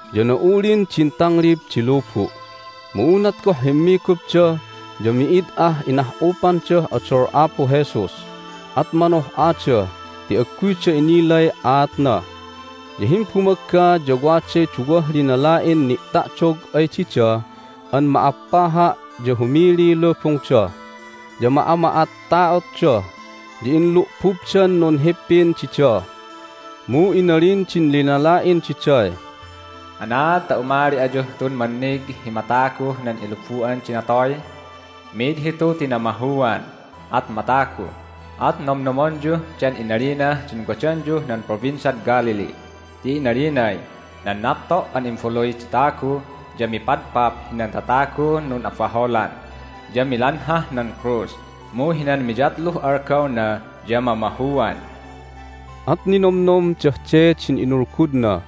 Ya na'ulin din tanglib di lubu'. Mu unat goh himmigupda ya mi'id ah inah'upandah odol Apu Jesus, at manoh'ada ti agguyda inilay aatna. Ya himbumagga ya waday duwah linala'in ni'ta'dog ay dida an ma'appaha' ya humiliy lubungda. Ya ma'ama'atta'otda, ya inlu'bubdan nunhippin dida. Mu inalin din linala'in diday, "Anaad ta umali ayuh tun mannig hi mataguh nan ilubu'an di natoy? Mid hitu ti namahuan, at matagu! At nomnomonyuh den inalinah din wadanyuh nan Provinciad Galilee ti inalinay, Nan napto' an Imbaluy di Tagu ya mipadpap hinan tatagun nun'abaholan, ya milanhah nan krus, mu hinan miyatluh algawna ya mamahuan." At ninomnomdah de din inulgudna.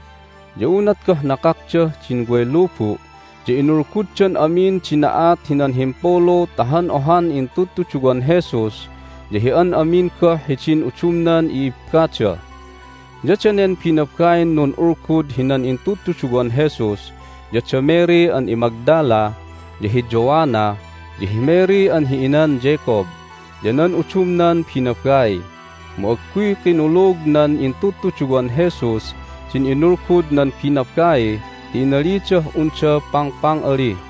Ya unat goh nakakdah din way lubu' ya inulguddan amin din na'at hinan himpulu ta han ohan intudtuduwan Jesus ya hi an amin goh hidin udumnan i'ibbada. Ya danen binabain nun'ulgud hinan intudtuduwan Jesus ya da Mary an iMagdala, ya hi Joanna, ya hi Mary an hi inan Jacob, ya nan udumnan binabai. Mu agguy kinulug nan intudtuduwan Jesus din inulgud nan binabai ti inalidah unda pangpang'ali.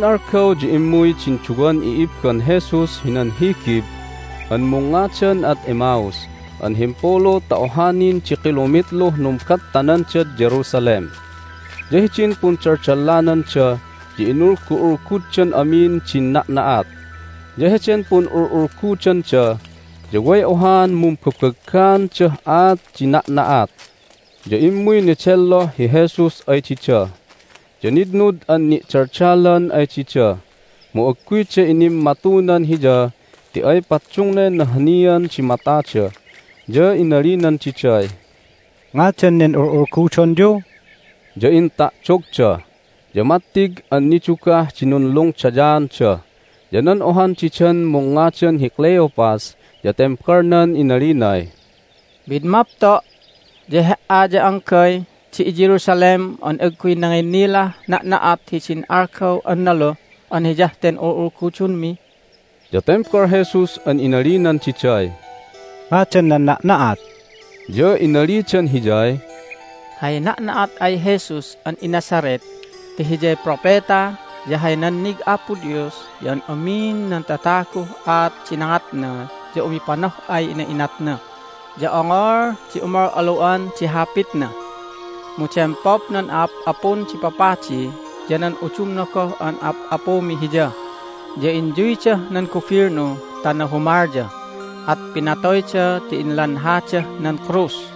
Heden algaw ya immuy din duwan i'ibban Jesus hinan higib an mungngadan ad Emmaus an himpulu ta oha nin di kilomitluh numbattanandad Jerusalem. Ya hidin pundaldallananda ya inulgu'ulguddan amin din na'na'at. Ya heden pun'ul'ulgudanda ya way ohaan mumbabaggaandah aat di na'na'at. Ya immuy nedelloh hi Jesus ay dida, ya nitnud an ni'daldalan ay dida, mu agguyda inimmatunan Hiya ti ay paddungnay nahanian di matada. Ya inalinan diday, "Ngadan nen ul'ulgudonyu?" Ya inta'dogda, ya mattig an nidugah di nunlungdayaanda. Ya nan ohan didan mungngadan hi Cleopas ya tembalnan inalinay, "Mid mapto' ya He"a ya anggay di iJerusalem an agguy nanginnilah na'na'at hidin algaw an naluh an hiyah ten ul'ulgudonmi!" Ya tembal Jesus an inalinan diday, "Ngadan nan na'na'at?" Ya inalidan Hiyay, "Hay na'na'at ay Jesus an iNazareth ti Hiyay propeta, ya hay nannig Apo Dios ya an amin nan tataguh aat di nangatna ya umipanoh'ay ina'inatna, ya ongol di umal'alu'an di hapitna. Mu dempap nan a'ap'apun di papadi ya nan udumna goh an a'ap'apumi Hiya, ya inyuydah nan gubilnu ta nahumalya, at pinatoyda ti inlanhadah nan krus.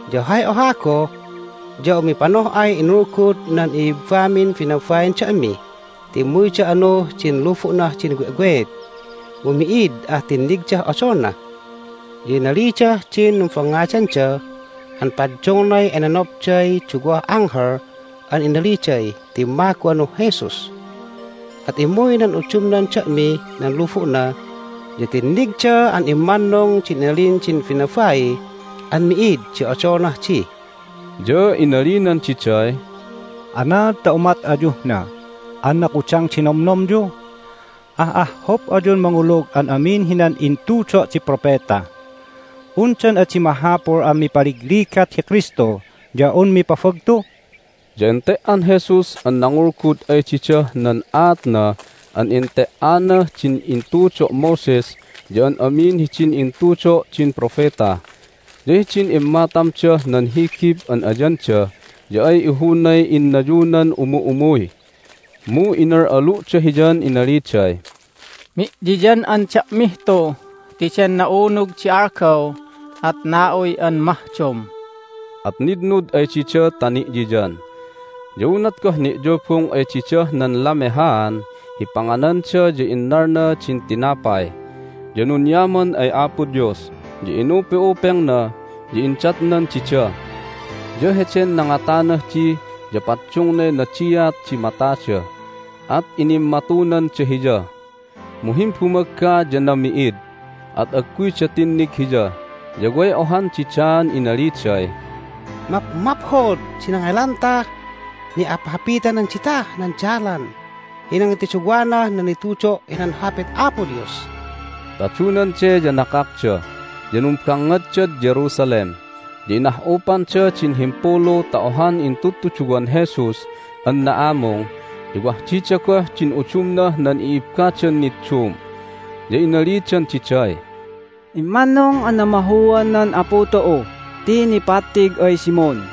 Ya hay oha goh ya umipanoh'ay inulgud nan i'ibbamin binabain da'mi ti immuyda anuh din lubu'nah din we'weet, mu mi'id ah tinnigdah odolna. Ya inalidah din numbangngadanda an paddungnay enenapday duwah anghel an inaliday timmagu anuh Jesus. At immuy nan udumnan da'mih nan lubu'na, ya tinnigda an immannung din inalin din binabai an mi'id di odolnah di." Ya inalinan diday, "Anaad ta umat ayuh na an nakudang di nomnomyu? Ah'ahhup ayun mangulug an amin hinan intudo' di propeta! Undan adi mahapul an mipaligligat hi Kristu ya un mipabagtu?" Ya ente"an Jesus an nangulgud ay didah nan aatna an ente"anah din intudo' Moses ya an amin hidin intudo' din propeta. Ya hidin immatamdah nan higib an ayanda ya ay ihunay innayunan umu'umuy. Mu inal'alu'da Hiyan inaliday, "Mi'yiyan'an da'mih tu ti den na'unug di algaw, at na'uy an mahdom." At nitnud ay dida ta ni'yiyan. Ya unat goh ni'yubung ay didah nan lamehaan hi pangananda ya innalna din tinapay, ya nunyaman ay Apo Dios, ya inupe'upengna, ya indatnan dida. Ya heden nangatanah di ya paddungnay nadiat di matada, at inimmatunanda Hiya. Mu himbumagga ya nami'id, at agguyda tinnig Hiya. Ya way ohan didaan inaliday, "Mapmaphod di nangelantah ni'haphapitanan ditah nan dalan hi nangituduwanah nan nitudo' hinan Hapit Apo Dios!" Tadunan de ya nakakda, ya numbangngaddad Jerusalem. Ya inah'upanda din himpulu ta ohan intudtuduwan Jesus an na'amung, ya wah dida goh din udumnah nan i'ibbadan niddum. Ya inalidan diday, "Immannung an namahuan nan Apu tu'u ti nipattig ay Simon!"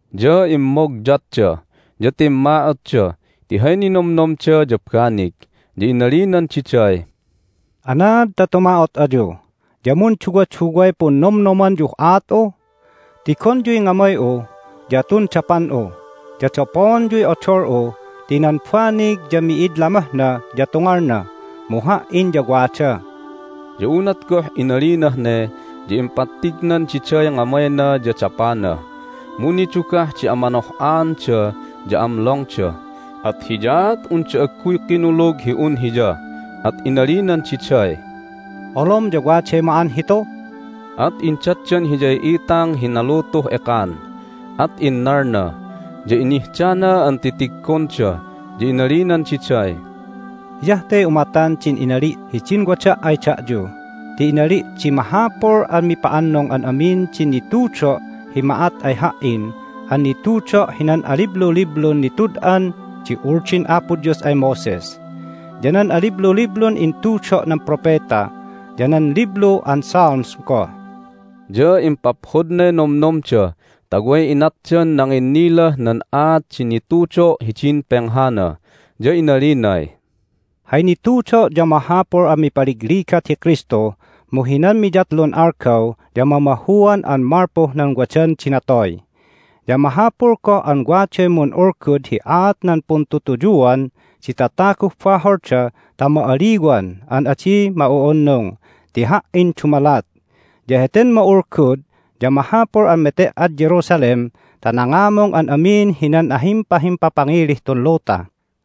Ya immogyatda ya timma'otda ti hay ninomnomda ya banig. Ya inalinan diday, "Anaad ta tuma'ot ayu, ya munduwaduway punnomnomanyuh aat'u? Tigonyuy ngamay'u ya tun dapan'u, ya dapoonyuy odol'u ti nan banig ya mi'id lamohna ya tungalna, mu Ha"in ya wada." Ya unat goh inalinah ne ya impattignan diday ngamayna ya dapana. Mu nidugah di amanoh'anda ya amlongda, at hiyaat unda agguy kinulug hi un Hiya, at inalinan diday, "Olom ya waday ma'an hitu?" At indatdan Hiyay itang hi nalutuh ekan, at innalna, ya inihdana an titiggonda. Ya inalinan diday, "Hiyah te umatan din inali' hidin wada' ay da'yu ti inali' di mahapul an mipa'annung an amin din nitudo' hi ma'at ay Ha"in an nitudo' hinan alibluliblun nitud'an di Uldin Apo Dios ay Moses, ya nan alibluliblun intudo' nan propeta, ya nan Liblu an Psalms goh." Ya impaphodnay nomnomda ta way inatdan nanginnilah nan aat di nitudo' hidin penghana, ya inalinay, "Hay nitudo' ya mahapul an mipaligligat hi Kristu, mu hinan miyatlun algaw ya mamahuan an malpuh nan wadan di natoy. Ya mahapul goh an waday mun'ulgud hi aat nan puntutuyuan di tataguh baholda ta ma'aliwan an adi ma'u'unung ti Ha"in dumalat. Ya heten ma'ulgud ya mahapul an mete"ad Jerusalem ta nangamung an amin hinan ahimpahimpapangilih tun luta.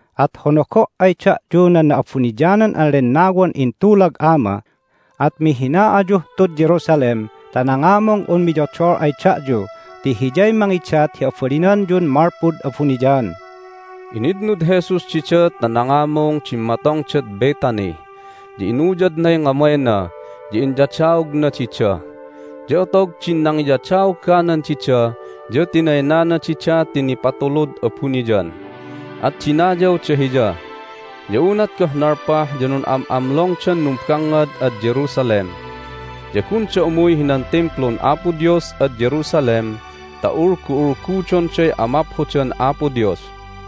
At honogo' ay da'yu nan Na'abuniyanan an Lennawan intulag Ama, at mihina ayuh tud Jerusalem ta nangamung un miyodol ay da'yu ti Hiyay mangidat hi abalinanyun malpud abuniyan." Initnud Jesus dida ta nangamung dimmatongdad Bethany, ya inuyadnay ngamayna, ya inyadaogna dida. Ya otog din nangiyadaoganan dida ya tinaynana dida ti nipatulud abuniyan, at dinayawda Hiya. Ya unat goh nalpah ya nun'am'amlongdan numbangngad ad Jerusalem. Ya gunda umuy hinan Timplun Apo Dios ad Jerusalem ta ulgu'ulgudonday amaphodan Apo Dios.